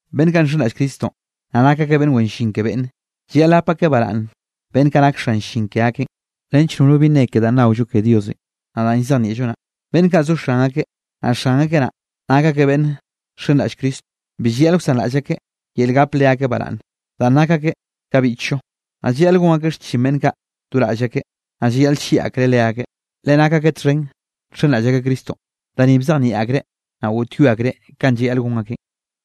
Beꞌnn kaꞌ nxenraꞌll Cristonꞌ, naꞌ nak akeꞌ beꞌnn wen llin ke beꞌnne, llayaꞌl gap akeꞌ baraꞌnne beꞌnn kaꞌ nak xan llin ke akeꞌn, nench nono bi nne ke danꞌ naollo ke Diosenꞌ, naꞌ danꞌ llzejnieꞌllo naꞌ. Beꞌnn kaꞌ zo xan akeꞌ, naꞌ xan akeꞌ naꞌ, nak akeꞌ beꞌnn nxenraꞌll Cristonꞌ, bi llayaꞌl wsanraꞌll akeꞌ yel gap leakeꞌ baraꞌnne danꞌ nak akeꞌ ka biꞌchllo. Naꞌ llayaꞌl gon akeꞌ xchin beꞌnn kaꞌ do raꞌll akeꞌ, naꞌ llayaꞌl llieꞌ akreꞌ leakeꞌ, le nak akeꞌ txhen nxenraꞌll akeꞌ Cristonꞌ. Da ni bzejnieꞌ akreꞌ, naꞌ goꞌtyoe akreꞌ kanꞌ llayaꞌl gon akeꞌn.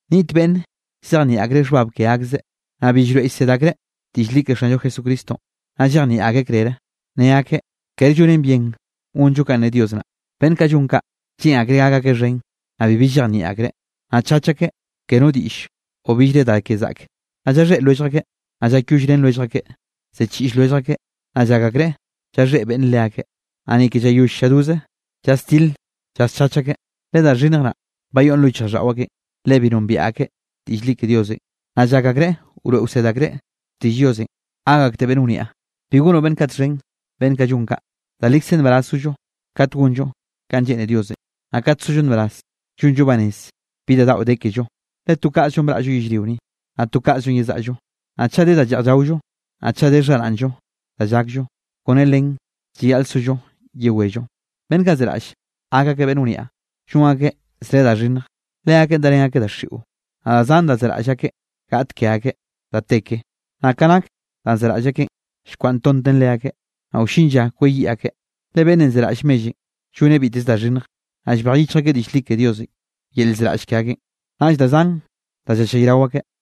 Niꞌt beꞌnn llzejnieꞌ akreꞌ xhbab ke akseꞌ, naꞌ bi llroeꞌ llsed akreꞌ diꞌll li ke Xanllo Jesucristonꞌ, naꞌ llejnieꞌ akreꞌ krere, ne akeꞌ kere llonen bien gonllo kanꞌ ne Dios naꞌ. Beꞌnn kaꞌ llon kaꞌ lleꞌn akreꞌ gak akeꞌ xhen, naꞌ bibi llejnieꞌ akreꞌ. Naꞌ chach akeꞌ ke no diꞌll o billre da ke zaꞌke, naꞌ llaxhéꞌ lwellj akeꞌ, naꞌ llakyollrén lwellj akeꞌ, ziꞌchiꞌll lwellj akeꞌ, naꞌ llak akreꞌ llaxhéꞌ beꞌnn leakeꞌ. Naꞌ ni ke llayoll lladoze llasdil llaschach akeꞌ, le da xhinnj naꞌn bayoꞌ lo yichjraꞌlldaꞌo akeꞌn, le bi nombiaꞌ akeꞌ diꞌll li ke Diosenꞌ. Naꞌ llak akreꞌ wroeꞌ wsed akreꞌ xtiꞌll Diosenꞌ gak akteꞌ beꞌnn wniaꞌ. Bi gonoꞌ beꞌnn kaꞌ txhen beꞌnn kaꞌ llon kaꞌ. Da likze nbaraz zollo kat gonllo kanꞌ lleꞌne Diosenꞌ, naꞌ kat zollo nbaraz llonllo banez bi da daꞌo de kello. Le to kaꞌzllonꞌ braꞌllo yellrio ni, naꞌ to kaꞌzllo yezaꞌllo. Naꞌ chaꞌ de da lleꞌj llaollo, naꞌ chaꞌ de xharaꞌnllo da llakllo, kone len llayaꞌl sollo yewello. Beꞌnn kaꞌ zeraꞌll gak akeꞌ beꞌnn wniaꞌ, llon akeꞌ zre da xhinnj, leakeꞌn darén akeꞌ daxiꞌo. Naꞌ da zan da zeraꞌll akeꞌ gaꞌt ke akeꞌ da te ke, naꞌ ka nak danꞌ zeraꞌll akeꞌn, llkwaꞌntonten leakeꞌ, naꞌ wllin lla kweyiꞌ akeꞌ. Le beꞌnnenꞌ zeraꞌll mellenꞌ lloneꞌ biteze da xhinnj. Naꞌ llbej yichj akeꞌ diꞌll li ke Diosenꞌ yel llzeraꞌll ke akeꞌn, naꞌll da zan da llallayrao akeꞌ.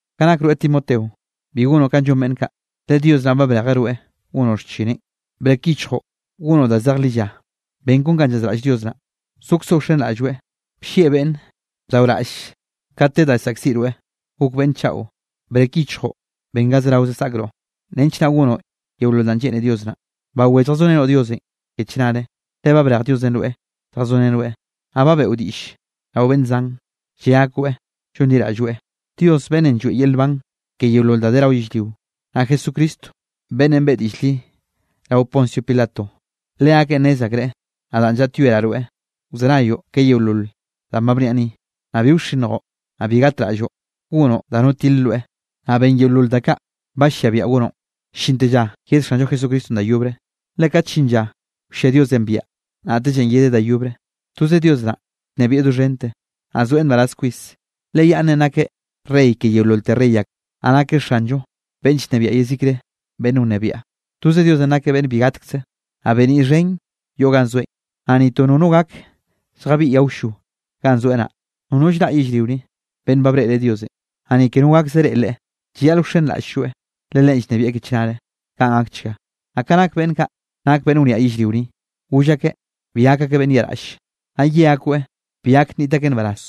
Ka nak rweꞌ Timoteo, bi gonoꞌ kanꞌ llon beꞌnn kaꞌ, le Dios naꞌ ba brejeꞌ rweꞌ gonoꞌ xchineꞌn. Brek yichjoꞌ gonoꞌ danꞌ zej lilla, ben kon kanꞌ llazraꞌll Dios naꞌ, sokzoꞌ wxenraꞌlloeꞌ, bllieꞌ beꞌnne, bdaoraꞌll kat de da llsaꞌkziꞌ rweꞌ, gok beꞌnne chaꞌo. Brek yichjoꞌ ben ga zerao saꞌkroꞌ, nench naꞌ gonoꞌ yeolol danꞌ lleꞌne Dios naꞌ. Bawé lljazorenoꞌ Diosenꞌ ke chnare, le ba brej Diosenꞌ rweꞌ lljazorenoeꞌ, naꞌ ba beꞌo diꞌll rao beꞌnn zan, lle akoeꞌ llonliraꞌlloeꞌ. Dios beꞌnnenꞌ lloeꞌ yel nban ke yeolol da de rao yellrio, naꞌ Jesucristo beꞌnnenꞌ beꞌe diꞌll li rao Poncio Pilato, leakeꞌn nnez akreꞌ nadaꞌn llaꞌtyoeraꞌ rweꞌ wzenayoꞌ ke yeolol danꞌ ba bniaꞌ ni, naꞌ bi wxinnjoꞌ, naꞌ bi gatraꞌlloꞌ gonoꞌ da no tile rweꞌ. Naꞌ ben yeolol da kaꞌ ba lliaꞌ biaꞌa gonoꞌn, llinte lla yed Xanllo Jesucristonꞌ da yobre. Le kat llin lla wllia Diosenꞌ biaꞌa, naꞌtellenꞌ yedeꞌ da yobre. Toze Dios naꞌn llnebieꞌ doxhente, naꞌ zoeꞌ nbaraz kwis. Le yaꞌnnenꞌ nakeꞌ Rey ke yeololte rey ak, naꞌ nakeꞌ Xanllo beꞌnn llnebiaꞌ yezikre beꞌnn wnebiaꞌ. Toze Diosenꞌ nakeꞌ beꞌnn bi gatkzeꞌ. Naꞌ beniꞌ xhen yoꞌ ganꞌ zoeꞌn, naꞌ ni to nono gak lljabiꞌyeꞌ awllo ganꞌ zoeꞌ naꞌ. Nono llraꞌ yellrio ni, beꞌnn ba breꞌreꞌ Diosenꞌ, naꞌ ni ke no gakzeꞌ reꞌe Leꞌe. Llayaꞌl wxenraꞌll-lloeꞌ, le Leꞌen llnebieꞌ ke chnare. Kaꞌn gakchga. Naꞌ ka nak beꞌnn kaꞌ nak beꞌnn wniaꞌ yellrio ni, goll akeꞌ bi gak gakeꞌ beꞌnn yaꞌraꞌlle. Naꞌ ye akoeꞌ bi gak nniꞌt akeꞌ nbaraz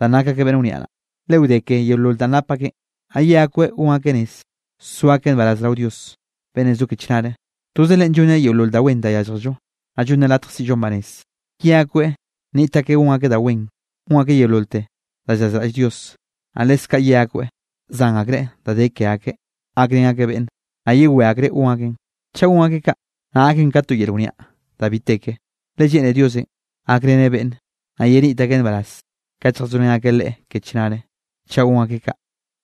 danꞌ nak akeꞌ beꞌnn wniaꞌ naꞌ, le wde ke yeolol danꞌ nap akeꞌn. Naꞌ ye akoeꞌ gon akeꞌ rez, so akeꞌ nbaraz rao Dios beꞌnnenꞌ zo ke chnare. Toze Leꞌen llonneꞌ yeolol da wen da yálljello, naꞌ llonneꞌ latj siꞌllo banez. Ye akoeꞌ nniꞌt akeꞌ gon akeꞌ da wen, gon akeꞌ yeololte da llazraꞌll Dios, naꞌ leskaꞌ ye akoeꞌ zan akreꞌ da de ke akeꞌ, gakrén akeꞌ beꞌnne, naꞌ yewé akreꞌ gon akeꞌn. Chaꞌ gon akeꞌ kaꞌ, naꞌ gaken ka to yel wniaꞌ da bi te ke, le lleꞌne Diosenꞌ gakreneꞌ beꞌnne, naꞌ yeniꞌt akeꞌ nbaraz kat lljazorén akeꞌ Leꞌe ke chnarenꞌ, chaꞌ gon akeꞌ kaꞌ.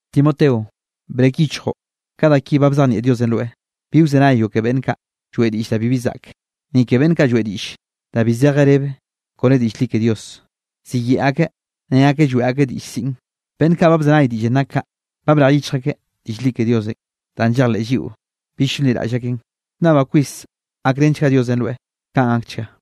Timoteo, brek yichjoꞌ ka da ki ba bzejnieꞌ Diosenꞌ rweꞌ. Bi wzenayoꞌ ke beꞌnn kaꞌ lloeꞌ diꞌll da bibi zaꞌke, ni ke beꞌnn kaꞌ lloeꞌ diꞌll danꞌ bi zeje rebe kone diꞌll li ke Dios. Ziyeꞌe akeꞌ ne akeꞌ lloeꞌ akeꞌ diꞌll siꞌn. Beꞌnn kaꞌ ba bzenay diꞌllenꞌ nak kaꞌ, ba brej yichj akeꞌ diꞌll li ke Diosenꞌ danꞌ llejleꞌ lliꞌo bill llonliraꞌll akeꞌn. Llnnabaꞌ kwis gakrenchga Diosenꞌ rweꞌ. Kaꞌn gakchga.